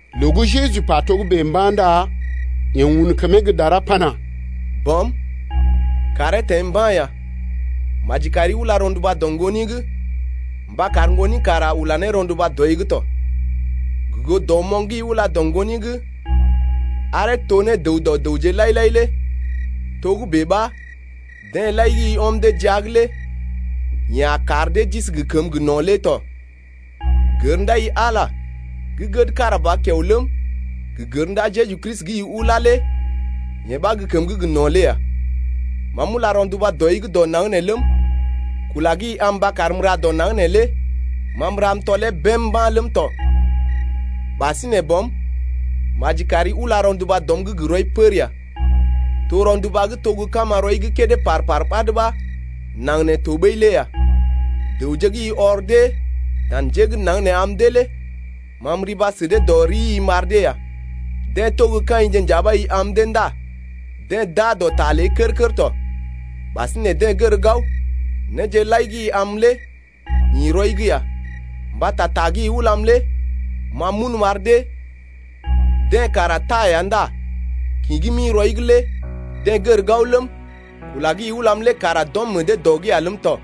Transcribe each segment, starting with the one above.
Loo gə́ Jeju pa togə́bè mba̰ ndá yeḛ un kəmee gə́ dara pana: Bɔm, kàree teḛ mba̰ ya. Maji kari ula rɔnduba dɔ Ŋgoni’g mba kar Ŋgoni kara ula ne rɔnduba dɔi’g tɔ. Gə goo dɔmoŋ gə́ i ula dɔ Ŋgoni’g aree to ne dəw dɔ dəwje lai-lai lé togə́bè ɓa deḛ lai gə́ i ɔm dee jia’g lé yeḛ a kar dee d’isi gə kəməgə́ gə no̰ lé tɔ. Gər ndaai-i Ala gə́ gəd kára ba kiao ləm, gə gər ndaa Jeju Kristi gə́ i ulá lé yee ɓa gə́ kəmə gə́ gə no̰ lé ya. Ma m’ula rɔnduba dɔi’g dɔ naŋg nee ləm, kula gə́ i am mba karm m’ra dɔ naŋg neelé ma m’ra m’tɔlee bém mba̰ ləm tɔ. Ɓasinè Bɔm, maji kari ula rɔnduba dɔm’g gə rɔi pər ya, to rɔnduba gə́ to gə kama rɔi’g kédé par-par ɓad ɓa naŋg nee to ɓəi lé ya. Dəwje gə́ i ɔr dee dan njé gə́ naŋg nee am dee lé ma m’riba sə dee dɔ rii m’ar dee ya. Deḛ to gə́ kaḭje nja ɓa i am dee ndá deḛ d’aa dɔ ta ləi kər-kər tɔ. Ɓasinè deḛ gər gao, néje lai gə́ i am lé ḭ rɔi’g ya, Mbata ta gə́ i ulam lé ma m’un m’ar dee. Deḛ kara taa ya ndá kḭ gə́ m’ḭ rɔi’g lé deḛ gər gao ləm, kula gə́ i ulam lé kara d’ɔm meḛ dee dɔ’g ya ləm tɔ.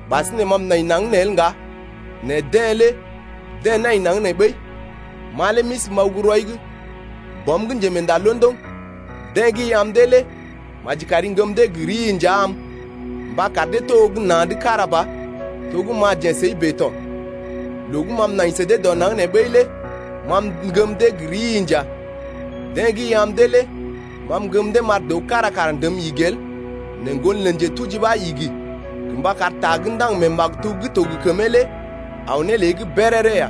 Ɓasinè ma m’nai naŋg nee el ŋga nɛ deḛ lé deḛ nai naŋg nee ɓəi, ma lé m’isi m’aw gə́ rɔi’g. Bɔm gə́ njemeenda londoŋ, deḛ gə́ i am dee lé maji kari ŋgəm dee gə rii nja am mba kar dee to gə́ na̰’d kára ba to gə́ ma jeḛ səi bèe tɔ. Loo gə́ ma m’nai sə dee dɔ naŋg nee ɓəi lé ma m’ŋgəm dee gə rii nja. Deḛ gə́ i am dee lé ma m’ŋgəm dee m’ar dəw kára kara ndəm igi el nɛ ŋgon lə njetuji ɓa igi gə mba kar ta gə́ ndaŋg mee maktub gə́ to gə kəmee lé aw ne lée’g béréré ya.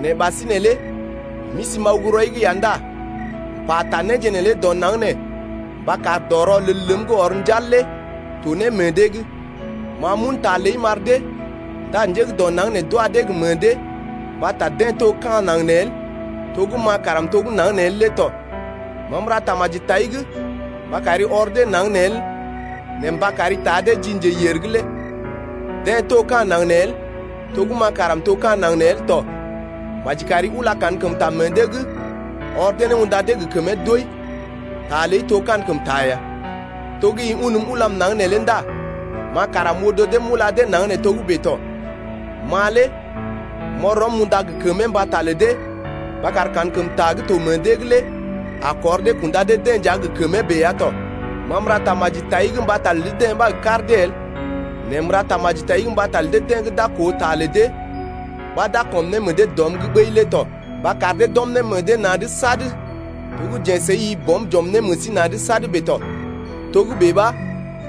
Nɛ ɓasinè lé m’isi m’aw gə́ rɔi’g ya ndá m’pata néje neelé dɔ naŋg nee mba kar dɔ rɔlel ləm gə́ ɔr njal lé to ne meḛ dee’g. Ma m’un ta ləi m’ar dee, ndá njé gə́ dɔ naŋg nee d’wa dee gə meḛ dee mbata deḛ to gə́ ka̰ naŋg nee el, to gə́ ma kara m’to gə́ naŋg nee el lé tɔ. Ma m’ra tamaji tai’g mba kari ɔr dee naŋg nee el nɛ mba kari taa dee ji Njeyèr’g lé. Deḛ to ka̰ naŋg nee el to gə́ ma kara m’to ka̰ naŋg nee el tɔ. Maji kari ula kankəmta meḛ dee’g ɔr dee ne unda dee gə kəmee doi, ta ləi to kankəmta ya. To gə́ i unm ulam naŋg neelé ndá ma kara m’odo dee m’ula dee naŋg nee togə́bè tɔ. Ma lé m’ɔr rɔm m’unda gə kəmee mbata lə dee mba kar kankəmta gə́ to meḛ dee’g lé a kɔr dee kunda dee-deḛ nja gə kəmee bèe ya tɔ. Ma m’ra tamaji tai’g mbata lə dee-deḛ ɓa gə kar dee el nɛ m’ra tamaji mbata lə deḛ gə́ d’a koo ta lə dee ɓa d’a kɔm ne meḛ dee dɔm’g ɓəi lé tɔ, mba kar dee d’ɔm ne meḛ dee na̰’d sad to gə́ jeḛ səi-i Bɔm j’ɔm ne meḛ sí na̰’d sad bèe tɔ, togə́bè ɓa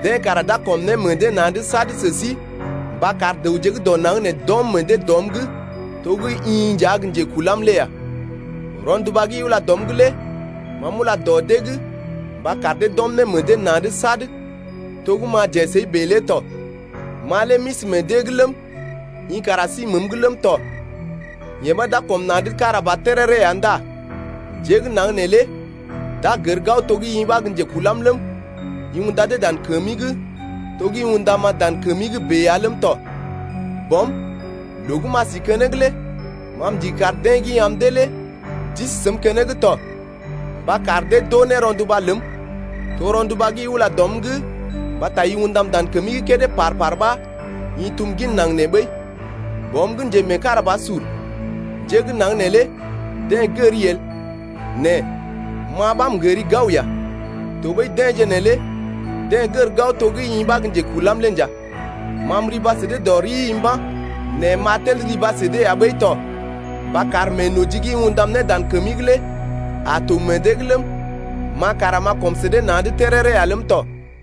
deḛ kara d’a kɔm ne meḛ dee na̰’d sad sə sí mba kar dəwje gə́ dɔ naŋg nee d’ɔm meḛ dee dɔm’g to gə́ i nja gə́ njekulam lé ya. Rɔnduba gə́ i ula dɔm’g lé ma m’ula dɔ dee’g mba kar dee d’ɔm meḛ dee na̰’d sad to gə́ ma jeḛ səi bèe lé tɔ. Ma lé m’isi meḛ dee’g ləm, i kara si məəm’g ləm tɔ, yee ɓa d’a kɔm na̰’d kára ba téréré ya ndá njé gə́ naŋg nee lé d’a gər gao to gə́ i ɓa gə́ njekulam ləm, i unda dee dan kəmi’g to gə́ i undam-ma dan kəmi’g bèe ya ləm tɔ. Bɔm, loo gə́ m’a si keneŋ lé ma m’ndigi kar deḛ gə́ i am dee lé d’isi səm keneŋ to mba kar dee d’oo ne rɔnduba ləm, to rɔnduba gə́ i ula dɔm’g mbata i undam dan kəmi’g kédé par-par ɓa i tum gin naŋg nee ɓəi. Bɔm gə́ njemeekarabasur, njé gə́ naŋg neelé deḛ gəri el, nɛ ma ɓa m’gəri gao ya, tɔɓəi deḛje neelé deḛ gər gao to gə́ i ɓa gə́ njekulam lé nja. Ma m’riba sə dee dɔ rii mba̰, nɛ m’a tel riba sə dee ya ɓəi to mba kar meenoji gə́ i undam ne dan kəmi’g lé a to meḛ dee’g ləm, ma kara m’a kɔm sə dee na̰’d téréré ya ləm tɔ.